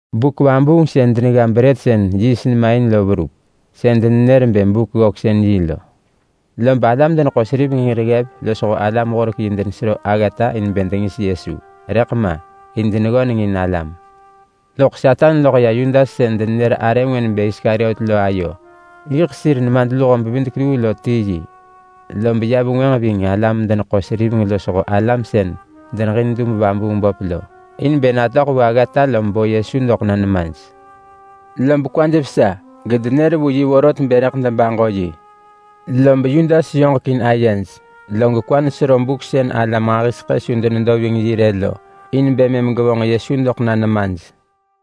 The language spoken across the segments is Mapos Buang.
Buk vabuung sën denegga brët sën yiist nema in lo verup. Sën denenër bë Buk-ggöksën-yi lo. Lob alam-deneḳo-seriveng hir ggev losho alam-horek-yi denesero aggata bë dengis Yesu. Rëḳ ma in deneggönengin alam. Loḳ Satan loḳ ya Yudas sën denenër arë ngwë nebë Iskariot lo ayo. Yiḳ sir nemadluho-bevidek-luu lo ti yi, lob ya vengwënġ ving alam-deneḳo-seriveng losho alam sën deneġin dub-vabuung-böp lo, in bë natöḳ vu aggata lob bo Yesu doḳ na nemaj. Lob kwaj vesa, gedenër vu yi vorot bë rëḳ debaġo yi. Lob Yudas yoġek in ayej, log kwa nesero buk sën alam nġahiseḳë su denedo ving yi rë lo, in bë mëm gevonġ Yesu doḳ na nemaj.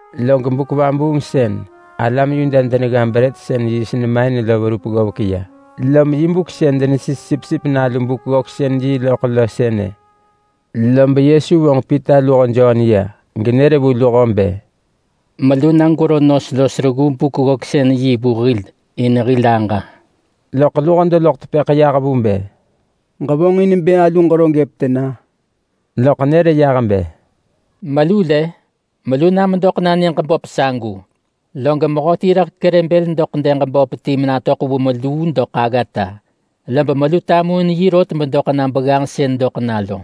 Log Buk-vabuung sën alam Yuda denegga brët sën yiist nema in lo verup ggovek ya, lom yiḳ buk sën denesis sipsip nalu Buk-ggöksën-yi yi loḳ lo sënë. Lob Yesu vonġ Pita luho Jon ya, genër vu luho bë, “Melu na gwero nos los reggu Buk-ggöksën-yi vu hil in hil aġa.” Loḳ luho deloḳ tepëḳ yah vu bë, “Ġevonġin bë alu ġero gëp tena?” Loḳ nër yah bë, “Melu lë! Melu na medoḳ na nyëġ böp sagu, log mehöti rëḳ kerë bël doḳ dëg böp ti menatöḳ vu meluu doḳ aggata. Lob melu tamuin yi rot bedoḳ na begganġ sën doḳ na lo.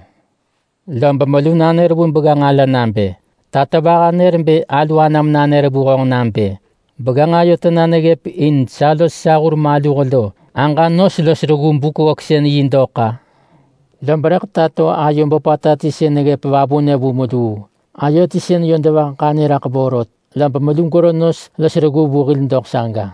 Lob melu nanër vu begganġ ala nabë, ‘Tatovaha nër bë alu anam nanër vu honġ nabë, “Begganġ ayo tena in sa los sa hur maluh lo aġa nos los reggu Buk-ggöksën-yi dok-a?” ’ Lob rëḳ tato ayo böpata ti sën neggëp vavunë vu meluu, ayo ti sën yö devah ḳanyë raḳ vorot. Lob melu gwero nos los reggu vu hil doḳ saga.”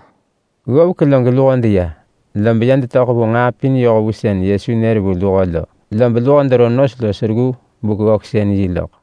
Ggovek log luho deya, lob ya detöḳ vu nġaa pin yoh vu sën Yesu nër vu luho lo. Lob luho dero nos los reggu Buk-ggöksën-yi loḳ.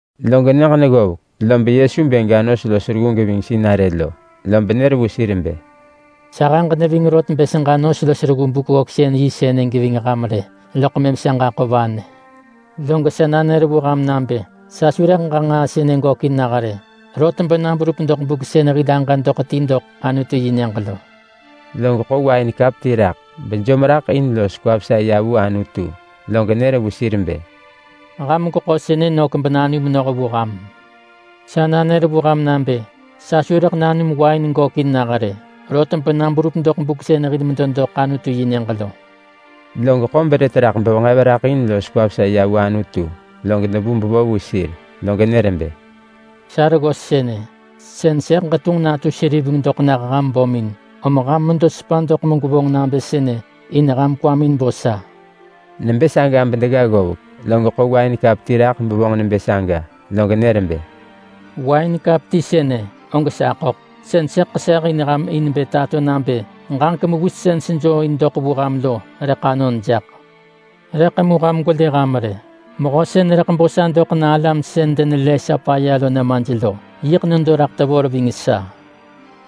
Log nyëġ neggovek, lob Yesu bë ga nos los reggu geving sinarë lo. Lob nër vu sir bë, “Sahëġ neving rot bë seġa nos los reggu Buk-ggöksën-yi sënë geving ham rë, loḳ mëm sa ġaḳo vanë. Log sa nanër vu ham nabë: Sa su rëḳ ġa nġaa sënë gökin nah rë, rot bena berup doḳ buk sën hil aġa doḳ ti vu Anutu-yi-nyëġ lo.” Log ḳo wain kap ti raḳ bejom raḳ in los kwa vesa ya vu Anutu log nër vu sir bë, “Ham gweḳo sënë nök benanum noh vu ham. Sa nanër vu ham nabë: Sa su rëḳ nanum wain gökin nah rë, rot bena berup doḳ buk sën hil medo doḳ Anutu-yi-nyëġ lo.” Log ḳo brët raḳ bevenġev raḳ in los kwa vesa ya vu Anutu, log debu bevo vu sir. Log nër bë, “Sa reggos sënë. Sën sëḳ ġetunġ natu seriveng doḳ nah ham bömin. Om ham medo sepa doḳ megwevonġ nabë sënë in ham kwamin bo sa.” Nebë saga bedegga ggovek, log ḳo wain kap ti raḳ bevonġ nebë saga, log nër bë, “Wain kap ti sënë og sa ḳöḳ, sën sëḳ ḳeseh in ham in bë tato nabë ġaġek mewis sën sejoo in doḳ vu ham lo rëḳ anon jaḳ. Rëḳ mu ham gwelë ham rë! Mehö sën rëḳ bo sa doḳ na alam sën denelë sa paya nemaj lo yiḳ nedo raḳ tevor ving sa.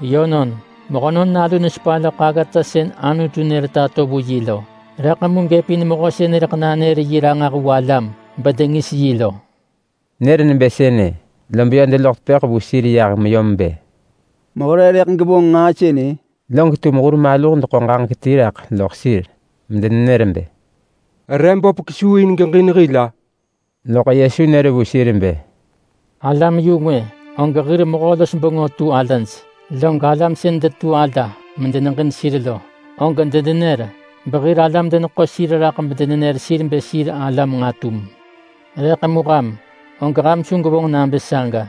Yönon, Mehönon Nalu nesepa loḳ aggata sën Anutu nër tato vu yi lo. Rëḳ mu gëpin mehö sën rëḳ nanër yi ranġah vu alam bedengis yi lo.” Nër nebë sënë, lob yö deloḳ tepëḳ vu sir yah meyom bë, “Mehö re rëḳ gevonġ nġaa sënë?” Log tum hur maluh deḳo ġaġek ti raḳ loḳ sir, medenenër bë, “Re böp kesuu in geġin hil-a?” Loḳ Yesu nër vu sir bë, “Alam-yu-ngwë, og hir mehö-los-bengö tu alaj. Log alam sën detu ala medeneġin sir lo, og denenër behir alam deneḳo sir raḳ bedenenër sir bë sir alam nġatum. Rëḳ mu ham, og ham su gwevonġ nabë saga.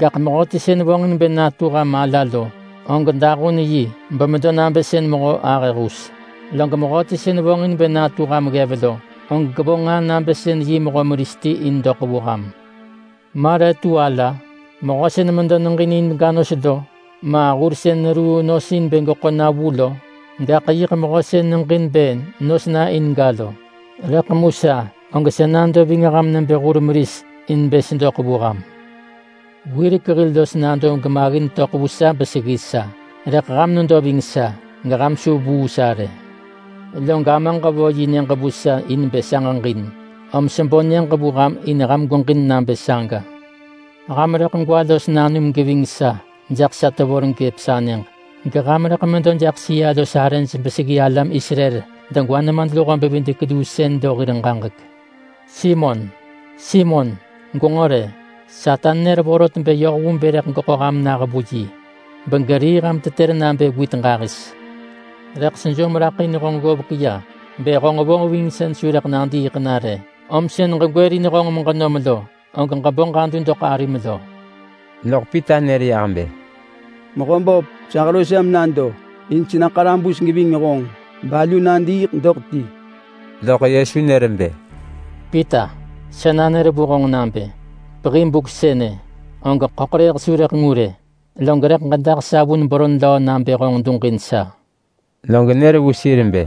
Gaḳ mehöti sën vonġin bë natu ham ala lo, og dahun yi bemedo nabë sën mehö ahë hus. Log mehöti sën vonġin bë natu ham ggev lo, og gevonġ nġaa nabë sën yi mehö meris ti in doḳ vu ham. Ma re tu ala? Mehö sën medo neġin in ga nos lo, ma hur sën neruu nos in bë geḳo na vu lo? Gaḳ yiḳ mehö sën neġin bë nos na in ga lo! Rëḳ mu sa, og sa nado ving ham nebë hur meris in bë sedoḳ vu ham. Wirek hil los nado gemaggin töḳ vu sa beseggi sa, rëḳ ham nedo ving sa, geham su vuu sa rë. Log Amaġ vo yi nyëġ vu sa in bë sa ġeġin, om sebo nyëġ vu ham in ham gweġin nabë saga. Ham rëḳ gwa los nanum geving sa jaḳ sa tevor gëp sa nyëġ. Geham rëḳ medo jaḳ sëa-los-arëj beseggi alam Israel degwa nemadluho-bevidek-luu sën lo hir ġaġek.” “Simon, Simon, gwenġo rë! Satan nër vorot bë yoh vu bë rëḳ geḳo ham na vu yi, begerii ham tetër nabë wit ġahis. Rëḳ sejom raḳ in honġ ggovek ya bë honġ vonġvingsën su rëḳ nadiiḳ na rë. Om sën ġegwërin honġ meġenom lo, og ġebo ġadu doḳ arim lo.” Loḳ Pita nër yah bë, “Mehöböp, sa hero sa menado in sena ḳarabus geving honġ balu nadiiḳ doḳ ti.” Loḳ Yesu nër bë, “Pita, sa nanër vu honġ nabë: Pehi buk sënë, og ḳöḳrëëh su rëḳ ngu rë, log rëḳ ġedah sa vun beron löö nabë honġ duġin sa.” Log nër vu sir bë,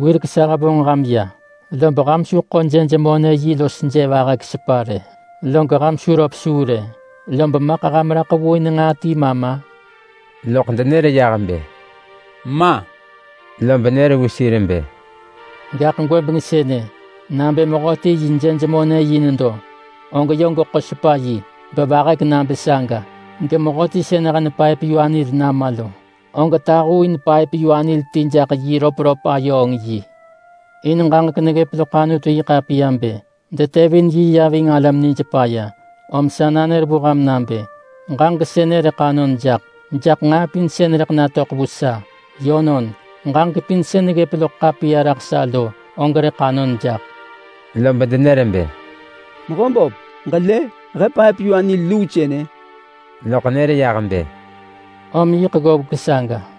“Wirek sa hevonġ ham ya, lob ham su ḳo jej-monë-yi los je vahek sepa rë. Log ham su röp suu rë, lob maḳ ham raḳ vu in nġaa ti ma ma?” Loḳ denër yah bë, “Ma!” Lob nër vu sir bë, “Gaḳ gwëbeng sënë nabë mehöti yi jej-monë-yi nedo, og yö geḳo sepa yi. Bevahek nabë saga. Gemehöti sën hen paëp-yu-anil nama lo, og tahuuin paëp-yu-anil ti jaḳ yi röpröp-ayööng-yi. In ġaġek neggëp loḳ Anutu-yi-ḳapiya bë, ‘Detevin yi ya ving alam nij paya.’ Om sa nanër vu ham nabë: Ġaġek sënë rëḳ anon jaḳ, jaḳ nġaa pin sën rëḳ natöḳ vu sa. Yönon, ġaġek pin sën neggëp loḳ ḳapiya raḳ sa lo, og rëḳ anon jaḳ.” Lob denër bë, “Mehöböp, ġelë? He paep-yu-anil luu sënë!” Loḳ nër yah bë, “Om yiḳ ggovek saga.”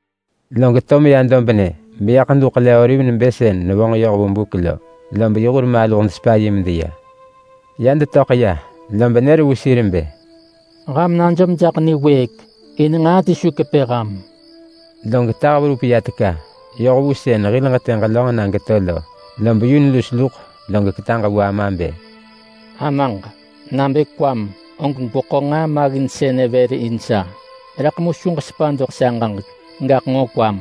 Log to meya dobnë beya Ḳedu Ḳele-oliv nebë sën nevonġ yoh vu buk lo. Lob yi hur maluh desepa yi medeya. Ya detöḳ ya, lob nër vu sir bë, “Ham najom jaḳ niwëëk, in nġaa ti su kepë ham.” Log tah verup ya teka, yoh vu sën hil ġetë ġelönġ na geto lo, lob yun lus log ketaġ vu Ama bë, “Amaġ, nabë kwam, og gweḳo nġaa maggin sënë vër in sa. Rëḳ mu su ġesepa doḳ sa ġaġek, gaḳ nġo kwam.”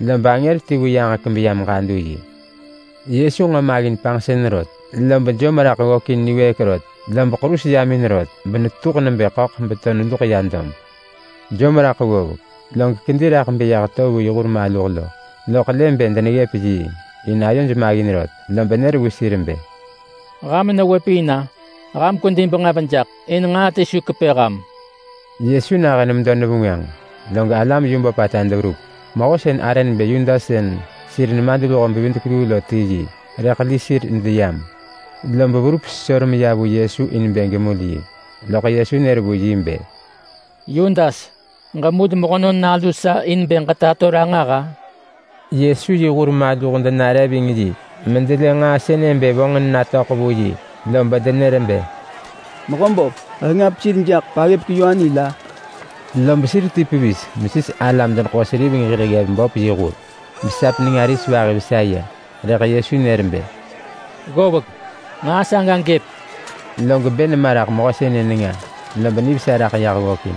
[Lob angër ti vu yaġek beyam ġadu yi. Yesu nġo maggin panġsën rot, lob jom raḳ ggökin niwëëk rot. Lob ḳerus yam in rot benetetuḳ nebë ḳöḳ beto neluḳ ya dob.] Jom raḳ ggovek, log kedi raḳ beyah to vu yi hur maluh lo. Loḳ lë bë deneggëp yiing, in ayoj maggin rot. Lob nër vu sir bë, “Ham newëp in-a? Ham kwedi benġev jaḳ, in nġaa ti su kepë ham.” Yesu nahën medo nevengwënġ, log alam yu böpata deverup. Mehö sën arë nebë Yudas sën sir nemadluho-bevidek-luu lo ti yi, rëḳ li sir medeyam. Lob verup sesor meya vu Yesu in bë gemul yi. Loḳ Yesu nër vu yi bë, “Yudas, ġemul Mehönon Nalu in bë ġetato yi ranġah-a?” Yesu yi hur maluh denare ving yi medelë nġaa sënë bë vonġin natöḳ vu yi, lob denër bë, “Mehöböp, he ngap sir jaḳ paggëpek-yu-anil-a?” Lob sir ti pevis mesis alam-deneḳo-seriveng hir ggev böp yi hur, besap nenga ris vahi vesa ya. Rëḳ Yesu nër bë, “Ggovek! Nġaa saga gëp!” Log bë nema raḳ mehö sënë nenga, lob nivesa raḳ yah ggökin.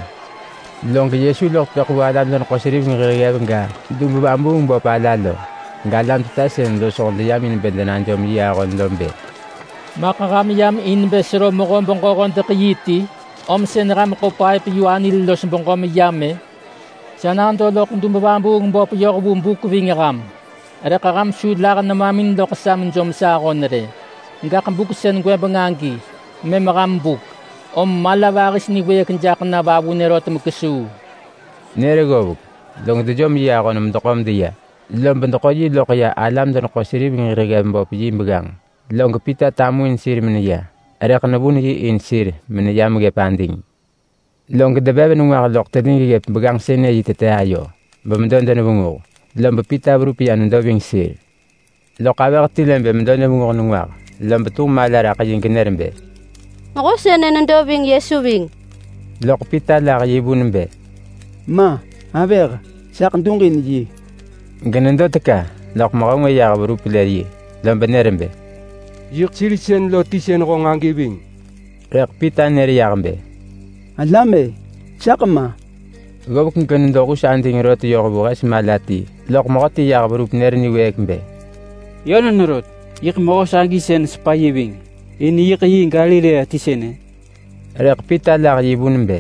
Log Yesu loḳ tepëḳ vu alam-deneḳo-seriveng hir ggev ga, dub-vabuung-böp ala lo, galam teta sën losho deyam in bë denajom yi ahon lo bë, “Maḳ ham yam in bë sero mehö-beġö-hodeḳ-yi ti om sën ham ḳo paëp-yu-anil los beġö meyam-ë? Sa nado loḳ dub-vabuung-böp yoh vu buk ving ham, rëḳ ham su lah nemamin loḳ sa mejom sa ahon rë. Gaḳ buk sën gwëbeng agi, mëm ham buk. Om mala vahis niwëëk jaḳ na vavunë rot mekesuu.” Nër ggovek log dejom yi ahon medeḳo medeya. Lob deḳo yi loḳ ya alam-deneḳo-seriveng hir ggev böp yi begganġ. Log Pita tamuin sir meneya, rëḳ nevun yi in sir meneyam ggëp ading. Log devev nengwah loḳ telig ggëp begganġ sënë yi tete ayo, bemedo denevenguh. Lob Pita verup ya nedo ving sir. Loḳ avëh ti lë bë medo nevenguh nengwah, lob tunġ mala raḳ yi genër bë, “Mehö sënë nedo ving Yesu ving.” Loḳ Pita lah yi vun bë, “Ma! Avëh, saḳ duġin yi.” Genedo teka loḳ mehö ngwë yah verup lë yi, lob nër bë, “Yiḳ sir sën lo ti sën honġ agi ving.” Rëḳ Pita nër yah bë, “Alam-e! Saḳ ma!” Ggovek genedo hus ading rot yoh vu hes mala ti loḳ mehöti yah verup nër niwëëk bë, “Yönon rot, yiḳ mehö sagi sën nesepa yi ving. In yiḳ yi Galilea ti sënë!” Rëḳ Pita lah yi vun bë,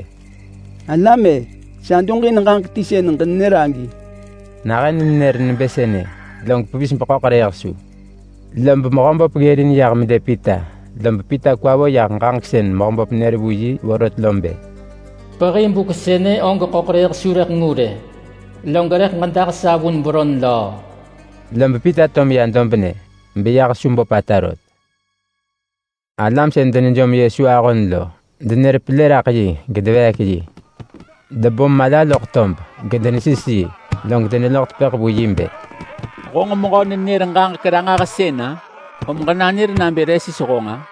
“Alam-e! Sa duġin ġaġek ti sën ġenenër agi!” Nahën nenër nebë sënë, log pevis beḳöḳrëëh su. Lob Mehöböp ggërin yah melë Pita. Lob Pita kwa vo yah ġaġek sën Mehöböp nër vu yi vorot lo bë, “Pehi buk sënë og ḳöḳrëëh su rëḳ ngu rë, log rëḳ ġedah sa vun beron löö.” Lob Pita to meya dobnë, beyah su böpata rot. Alam sën denejom Yesu ahon lo denër pelë raḳ yi gedeveek yi. Debom mala loḳ tob, gedenesis yi, log deneloḳ tepëḳ vu yi bë, “Honġ mehö-nenër-ġaġek-ranġahsën-a? Om ġenanër nabë re sis honġ-a?”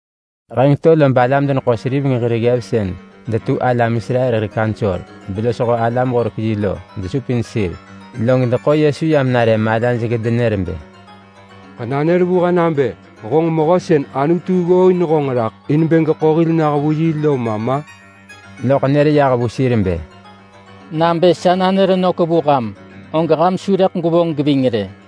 Heng to lob alam-deneḳo-seriveng hir ggev detu alam Israel hir kaunsor, belosho alam-horek-yi lo desupin sir, log deḳo Yesu yam nare malaj gedenër bë, “Ġenanër vu he nabë honġ Mehö sën Anutu ggooin raḳ in bë geḳo hil nah lo ma ma?” Loḳ nër yah vu sir bë, “Nabë sa nanër nök vu ham, og ham su rëḳ gwevonġ geving rë.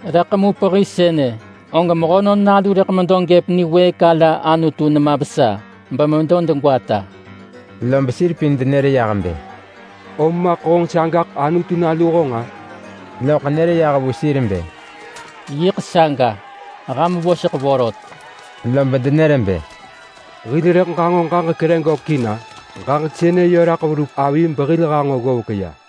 Rëḳ mu pehi sënë, og Mehönon Nalu rëḳ medo gëp niwëëk ala Anutu nema vesa bemedo degwata.” Lob sir pin denër yah bë, “Om maḳ honġ sagaḳ Anutu Nalu honġ-a?” Loḳ nër yah vu sir bë, “Yiḳ saga. Ham voseḳ vorot.” Lob denër bë, “Hil rëḳ ġanġo ġaġek re gökin-a? Ġaġek sënë yö raḳ verup avi behil hanġo ggovek ya.”